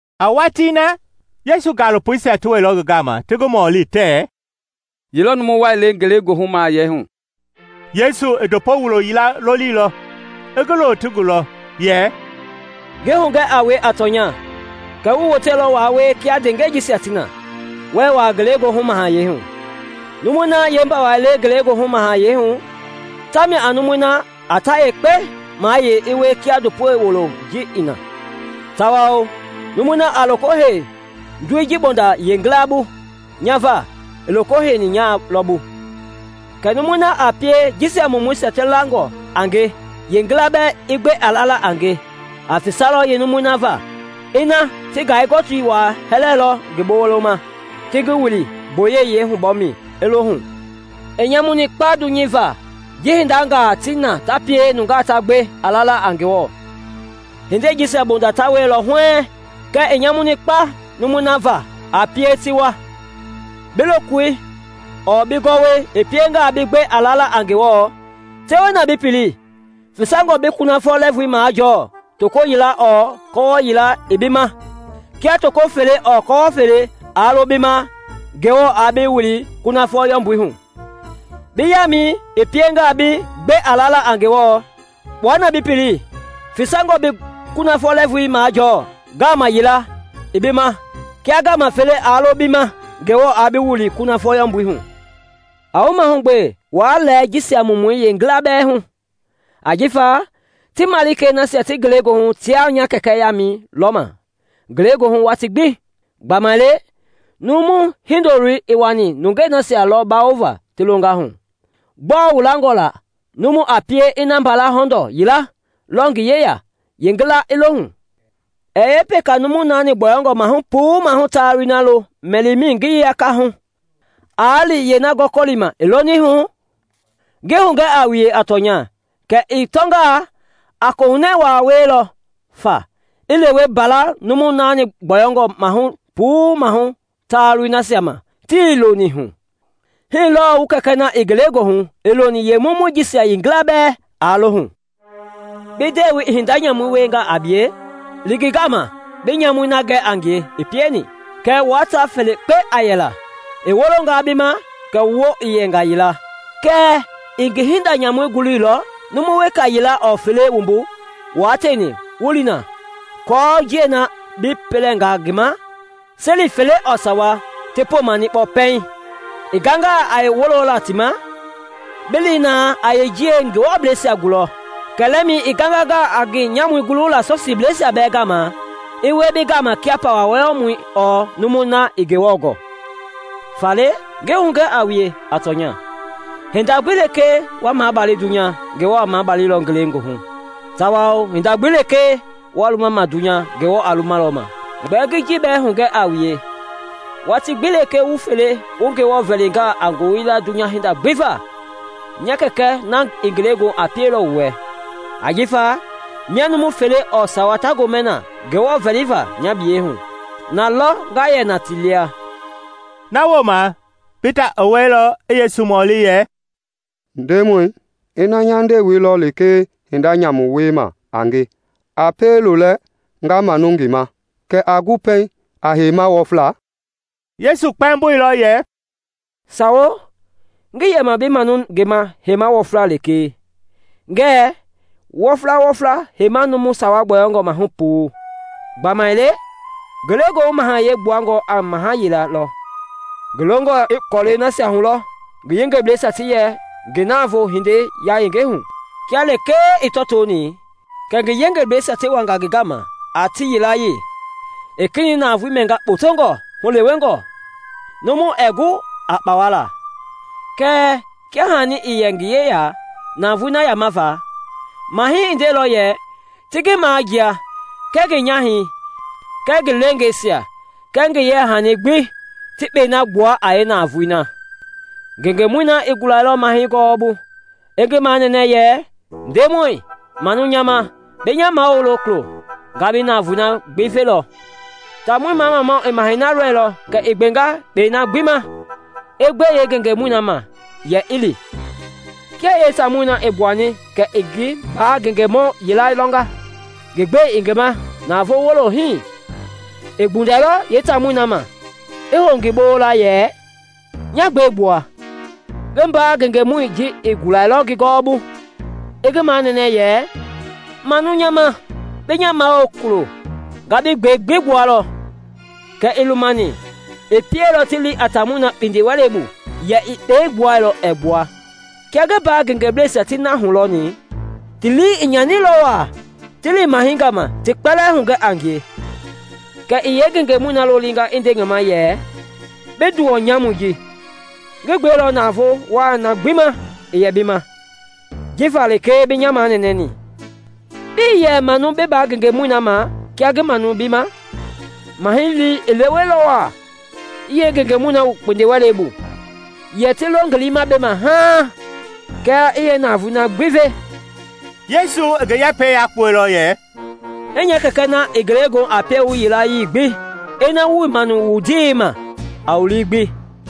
A watii na, Yesu gaalopoisia ti wɛilɔ ngi gama ti ngi mɔli tɛɛ, “Ye lɔ numu wai le ngelegoohu mahayɛi hu?” Yesu i ndopo wulo yila lolilɔ i ngi lo ti gulɔ, yɛ, “Ngi hugɛ a wue a tɔnya kɛ wuii woteilɔ waa wie kia ndeengɛisia ti na, wuɛɛ wuaa ngelegoohu mahayɛi hu. Numui na yeembawai le Ngelegoohu Mahayɛi hu tamia a numui na a ta yekpe mayei i wie kia ndopo wuloi ji i na. Tawao numui na a loko hei ndoi ji bonda yeengila bu nya va, i loko heini nya lɔ bu. “Kɛɛ numui na a pie jisia mumuisia ti langɔ a nge yeengila i gbe a lala a nge, a fisalɔ yeenumui na va ina ti ngai-gɔtii waa hɛlɛilɔ ngi boloma, ti ngi wili gboyei yeehubɔmɛi, i lo hu. I nyamuni kpa dunyei va ji hindangaa ti na ta pie nungaa ti gbe a lala a Ngewɔ! Hindei jisia bonda ta wielɔ huɛɛŋ kɛɛ i nyamuni kpa numui na va a pie ti wa! “Bi lokoi ɔɔ bi gɔwɔi i piengaa bi gbe a lala a Ngewɔ, tewe na bi pili; fisangɔe bi kunafɔ lɛɛvui majɔɔ toko yila ɔɔ kɔwɔ yila i bi ma kia toko fele ɔɔ kɔwɔ fele aa lo bi ma Ngewɔ aa bi wili kunafɔ yɔmbui hu. Bi yaamɛi i piengaa bi gbe a lala a Ngewɔ, kpua na bi pili; fisangɔe bi kunafɔ lɛɛvui majɔɔ ngaama yila i bi ma kia ngaama fele aa lo bi ma Ngewɔ aa bi wili kunafɔ yɔmbui hu. “A wu mahugbe waa lɛɛ jisia mumuisia yeengila bɛɛ hu; ajifa ti malikei nasia ti ngelegoohu tiaa nya Kɛkɛ yaama lɔma ngelegoohu watii gbi. [ Gbamaile Numu Hindoloi i wani nungei nasia lɔ bawoma ti longa hu.] “Gbɔɔ wu langɔ la numu a pie ina mbala hɔndɔɔ yila lɔ ngi yeya yeengila i lohu? Ɛɛ yeepeka numu naani gbɔyɔngɔ maahu puu maahu taalui lo mɛlimɛi ngiyei yakama aa li yeena gɔkɔlima i loni hu? Ngi hugɛ a wue a tɔnya kɛ i tɔngaa, a kohunɛ waa wielɔ fa i lewe mbala numu naani gbɔyɔngɔ maahu puu maahu taalui nasia ma tii lonihu. Hii lɔɔ wu Kɛkɛ na i ngelegoohu ii loni yeemumuii jisia yilayee bɛɛ i lohu.” “Bi ndewei i hinda nyamu wiengaa a bie, li ngi gama bi nyamui na gɛ a ngie i pieni, kɛɛ wua ta felekpe a yɛla. I wolongaa bi ma kɛ wu woo yɛnga yila. Kɛɛ ii ngi hinda nyamui guluilɔ, numu weka yila ɔɔ fele wumbu wua tieni wu li na, aako njiɛi na bi pɛlɛnga ngi ma, seli fele ɔɔ sawa ti poma-niikpɔ pɛiŋ. I gangangaa a wololaa ti ma, bi li na a yeenjiɛi Ngewɔ blɛisia gulɔ. Kɛlɛmɛi i gangangaa a ngi nyamui gulula Sɔsiibleisia bɛɛ gama, i wie bi gama kia pawa wɔyɔmɔ ɔɔ numui na ii Ngewɔ gɔɔ” “Faale ngi hugɛ a wue a tɔnya, hinda gbi lekee wa mabali dunya, Ngewɔ a mabalilɔ ngelegoohu, tawao hinda gbi lekee wa luma ma dunya, Ngewɔ a lumalɔ ma. “Gbɛɛ ngi ji bɛɛ hugɛ a wue, watii gbi lekee wu fele wu Ngewɔ vɛlingaa a ngoyila dunya hinda gbi va, nya Kɛkɛ na i ngelegoohu a pielɔ wu wɛ. Ajifa mia numu fele ɔɔ sawa ta gomɛ na Ngewɔ vɛliva nya biyei hu, na lɔ nga yɛ na ti lia.” Na wooma Pita i wɛilɔ i Yesu mɔli yɛ, “Ndemɔi, ina nya ndewei lɔ lekee hinda nyamu wiema a nge, a pie lolɛ nga manu ngi ma? Kɛ a gu pɛiŋ a heima wɔfla?” Yesu kpɛmboilɔ yɛ, “Sawo, ngii yɛma bi manu ngi ma heima wɔfla lekee, ngɛɛ wɔfla wɔfla heima numu sawa gbɔyɔngɔ maahu puu, gbamaile Ngelegoohu mahayɛi gbuangɔ a maha yila lɔ, ngi longɔ i kɔlɛi nasia hulɔ ngi yengebleisia ti yɛ ngi navoo hindei yayenge hu. Kia lekee i tɔtoni kɛ ngi yengebleisia ti wanga ngi gama a ti yilayee i kenɛi navoei mɛnga kpotongɔ hulewengɔ numu ɛɛ gu aa kpawa. Kɛɛ kia hani ii yɛ ngi yeya navoei na yamava na, mahɛi i ndeilɔ yɛ ti ngi majia kɛɛ ngi nyahɛi kɛɛ ngi leengeisia kɛɛ ngi yeyahani gbi ti kpɛi na gbua a yeenavoei. Ngengemɔi na i gulailɔ mahɛi gɔwɔbu i ngi manɛnɛ yɛ ‘Ndemɔi, manu nya ma, bi nya mawulo kulo, nga bi navoei gbi velɔ.’ Taamɔi mamamau i mahɛi lɔilɔ kɛ i gbenga kpɛi na gbi ma, i gbe yeengengemɔi ma yɛ i li. “Kia yeetaamɔi i gbuani kɛ i ngi mbaa ngengemɔ yila lɔnga ngi gbɛi i ngi ma a navoo wulo hii. I gbundɛilɔ yeetaamɔi ma, i hou ngi bola yɛ, ‘Nya gbɛi gbua!’ Ngi mbaa ngengemɔi ji i gulailɔ ngi gɔwɔbu i ngi manɛnɛ yɛ, ‘Manu nya ma bi nya mawulo kulo, nga bi gbɛi gbi gbualɔ.’ Kɛɛ ii lumani; i pielɔ ti li a taamɔi kpindiwɛlei bu yɛ ii kpɛi na gbuailɔ ɛɛ gbua. Kia ngi mbaa ngengeblɛisia ti na hulɔni, ti lii i nyanilɔ waa, ti li mahɛi gama ti kpɛlɛɛ hugɛ a ngie. Kɛ i yeengengemɔi lolia i nde ngi ma yɛ, ‘Bi nduwɔ nyamui ji! Ngi gbeilɔ nya navoo wai na gbi ma i yɛ bi ma jifa lekee bi nya manɛnɛni. Bii yɛ manu bi mbaa ngengemɔi na ma kia ngi manuni bi ma?’ Mahɛi lii i leweilɔ waa, i yeengengemɔi wu kpindiwɛlei bu yɛ ti lo ngi liima bema haaŋ kɛ i navoei na gbi ve.” Yesu i ngi yɛpɛi yakpuɛilɔ yɛ, “Hii nya Kɛkɛ na i ngelegoohu a pie a wu yilayee gbi ina wui i manuni wu ndewei ma a wu lii gbi.”